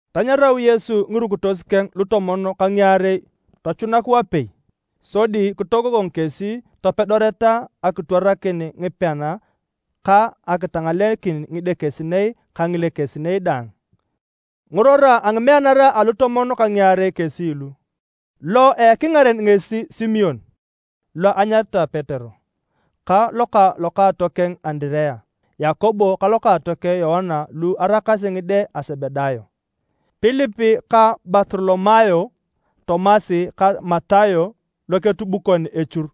Tanyarau Yesu ngirukitos keng lutomon ka ngiarei tochunak wapei, sodi kitogogong kesi topedoreta akitwarakin ngipean ka akitangalekin ngidekesinei ka ngilekesinei daang. Ngirora a ngimeanara alutomon ka ngiarei kesi lu: lo ekingaren ngesi Simon (lo anyaritae Petero) ka lokaatokeng Andirea, Yakobo ka lokaatokeng Yoana lu araakasi ngide a Sebedayo, Pilip ka Bartolomayo, Tomas ka Matayo loketubukon echur,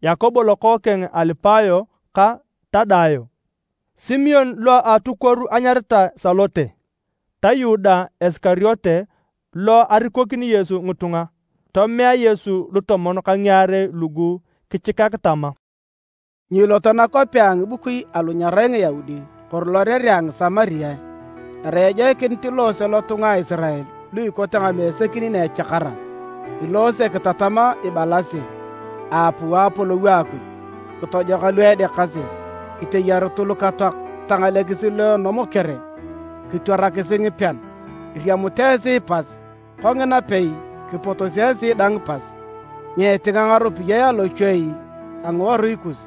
Yakobo lokookeng a Alipayo ka Tadayo, Simon lo a atukuoru enyaritae Salote, ta Yuda Isikariote lo arikokini Yesu ngitunga. Tomea Yesu lutomon ka ngiarei lugu kichikak tama, “Nyiiloto nakwapea a ngibukui alu nyerai Ngiyaudi kori lorerea a Ngisamariae. Erai ejoikinit iloose lotunga a Isirael lu ikote ngamesekin na echakara. Iloose kitatama ibalasi, ‘Aapuu Apolou a Akuj.’ Kitojoka lu edeakasi, kiteyarutu lukatoak, kitangalekisi lu a enomokere, kitwarakisi ngipean. Iriamut esi pas, kongina pei kipotosi esi dang pas. Nyiitinga ngaropiyae alochuei a ngiworui kus.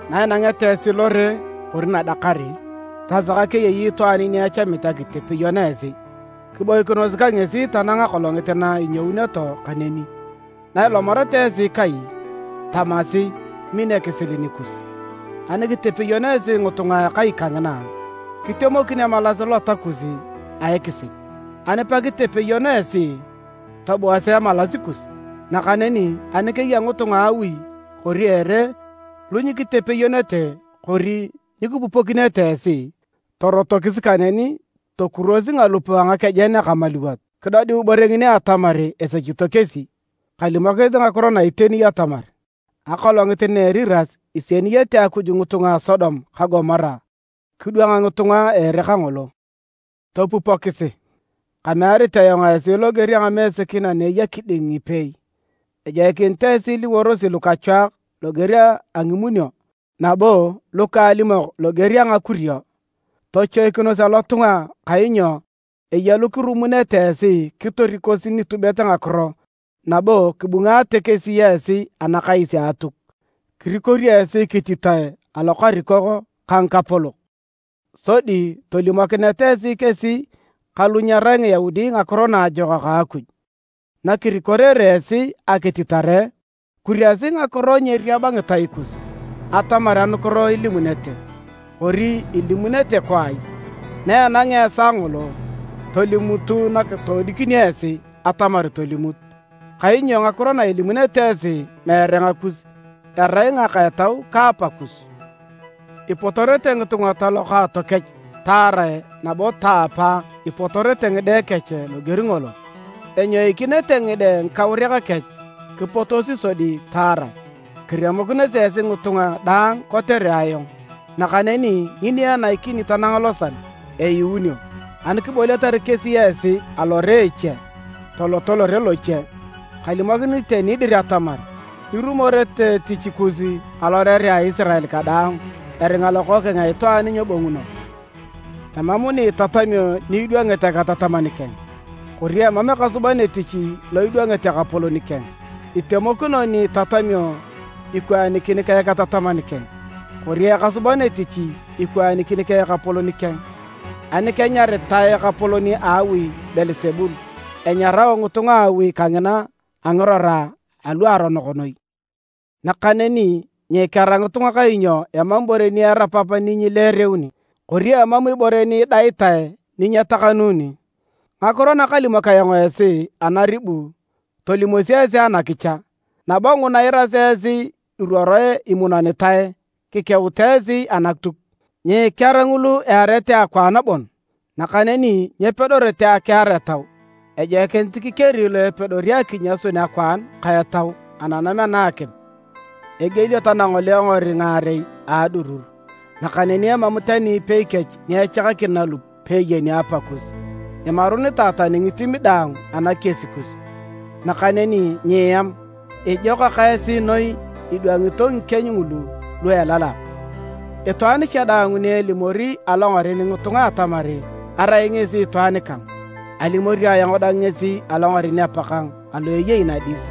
“Nainangeta esi lore kori nadakar, tasaka keyei itwaan ni echamit akitepeyon esi, kiboikinos ka ngesi tanang akolongit na inyouneto kaneni. Na ilomareta esi kai, tamasi, ‘Min ekisil nikus’. Ani kitepeyon esi ngitunga a akai kangina, kitemokin emalas lota kus a ekisil. Ani pekitepeyon esi, tobuasi emalas kus. Nakaneni ani keya ngitunga a awi kori ere lu nyikitepeyonete kori nyikipupokinete esi, torotokisi kaneni tokurwosi ngalup a ngakejen akamaluwot kidodiu ibore ngini atamar esechito kesi. Kalimokinit ngakiro na iteni atamar, akolongit na a Eriras isieniyete Akuj ngitunga a Sodom ka Gomora, kidwang ngitunga a ere kangolo. “Topupokisi, kamearit ayong esi loger a ngamesekin ana eya kiding ngipeei. Ejoikinit esi iliworosi lukachwaak loger a ngimunio nabo lukaalimok loger a ngakurio. Tochoikinos alotunga kainyo eya lukirumunete esi kitorikosi nitubet ngakiro nabo kibungaate kesi esi anakais a Atuk. Kirikorio esi kititae alokarikok ka ngikapolok sodi tolimokineta esi kesi ka lu nyerai Ngiyaudi Ngakiro Naajokak a Akuj. Nakirikorere esi akititare, kuriasi ngakiro nyeeriab ngitai kus atamar anukiro ilimunete, kori ilimunete kwaai. Naenangea esaa ngolo, tolimutu nakitoodikinio esi atamar tolimut. Kainyo ngakiro na ilimunete esi meere ngakus, erai ngaka a Etau ka Apakus. “Ipotorete ngitunga ta lokaatokech taarae nabo taapa ipotorete ngide kech loger ngolo. Enyoikinete ngide ngikauriak kech kipotosi sodi taarae. Kiremokinosi esi ngitunga daang kotere ayong. Nakaneni ngini enaikini tanang losal, eyuunio. Ani kiboliatar kesi esi alore a eche, toloto lore loche. Kalimokinit iteni dir atamar, nyirumorete etich kus alorerea a Isirael kadaang eringa Lokookeng a Itwaan nyebonguno. “Emam ni itatamio ni idwangit eketataman keng, kori emam ekasuban etich lo idwangit ekapolon keng. Itemokino ni itatamio ikwaanikin ka eketataman keng, kori ekasuban etich ikwaanikin ka ekapolon keng. Ani kenyaritae ekapolon a awi Beelsebul, enyarao ngitunga a awi kangina a ngirora aluaronok noi. “Nakaneni nyiikear ngitunga kainyo emam ibore ni erapap ni nyileereuni, kori emam ibore ni idaitae ni nyetakanuni. Ngakiro nakalimok ayong esi anaribu tolimosi esi anakicha, nabo nguna iirasi esi iruoroe imunonitae kikeutu esi anatuk. Nyikear ngulu earete akwaan bon nakaneni nyepedorete akiar etau. Ejoikinit kikeri lo epedori akinyasun akwaan ka etau ananam ana a akim. Egielio tanangolengor ngaarei a adurur, nakaneni emam tani ipei kech ni echakakin nalup peeyeni Apakus. Imarunitae tani ngitim daang anakies kus. Nakaneni nyieam! Ijokak esi noi idwangito ngikieny ngulu lu elalak. “Itwaan cha daang ni elimori alongaren ngitunga atamar arai ngesi itwaan kang, alimori ayong dang ngesi alongaren Apakang alo eyei nadis.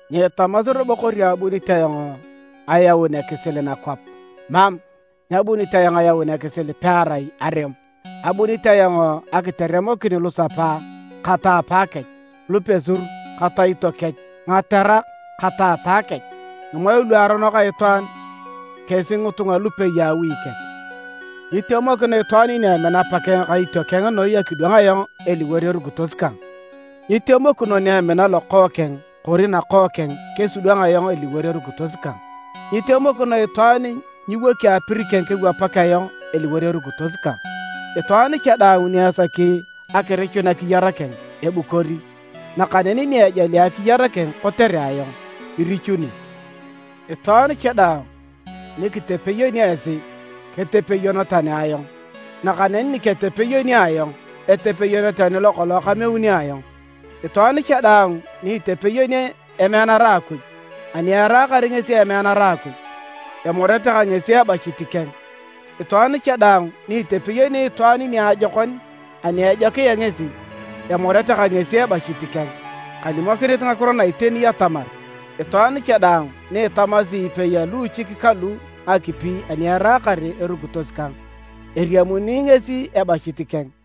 “Nyiitamasi robo kori abuni ayong ayaun ekisil nakwap. Mam! Nyabunit ayong ayaun ekisil pearai arem. Abunit ayong akiteremokin lusapa ka ta apakech, lupesur ka taito kech, ngaterak ka taata kech. Ngimoe luaronok a itwaan kesi ngitunga lupei a awi keng. “Nyitemokino itwaan ni emina apakeng ka itiokeng noi akidwang ayong eliwor erukitos kang. Nyitemokino ni emina lokookeng kori nakookeng kesidwang ayong eliwor erukitos kang. Nyitemokino itwaan ni nyiwoki apir keng kewapak ayong eliwor erukitos kang. Itwaan cha daang ni esaki akirichun akiyar keng, ebukori, nakaneni ni ejali akiyar keng kotere ayong, irichuni. “Itwaan cha daang ni kitepeyoni esi, ketepeyon tani ayong, nakaneni ni ketepeyoni ayong, etepeyon tani lokolong kameuni ayong. Itwaan cha daang ni itepeyoni emeanara a Akuj ani eraakar ngesi emeanara a Akuj, emorete ka ngesi ebachit keng. Itwaan cha daang ni itepeyoni itwaan niajokon ani ejokia ngesi, emorete ka ngesi ebachit keng. Kalimokinit ngakiro na iteni atamar, itwaan cha daang ni itamasi epei a luuchik kalu ngakipi ani eraakar erukitos kang, eriamuni ngesi ebachit keng.”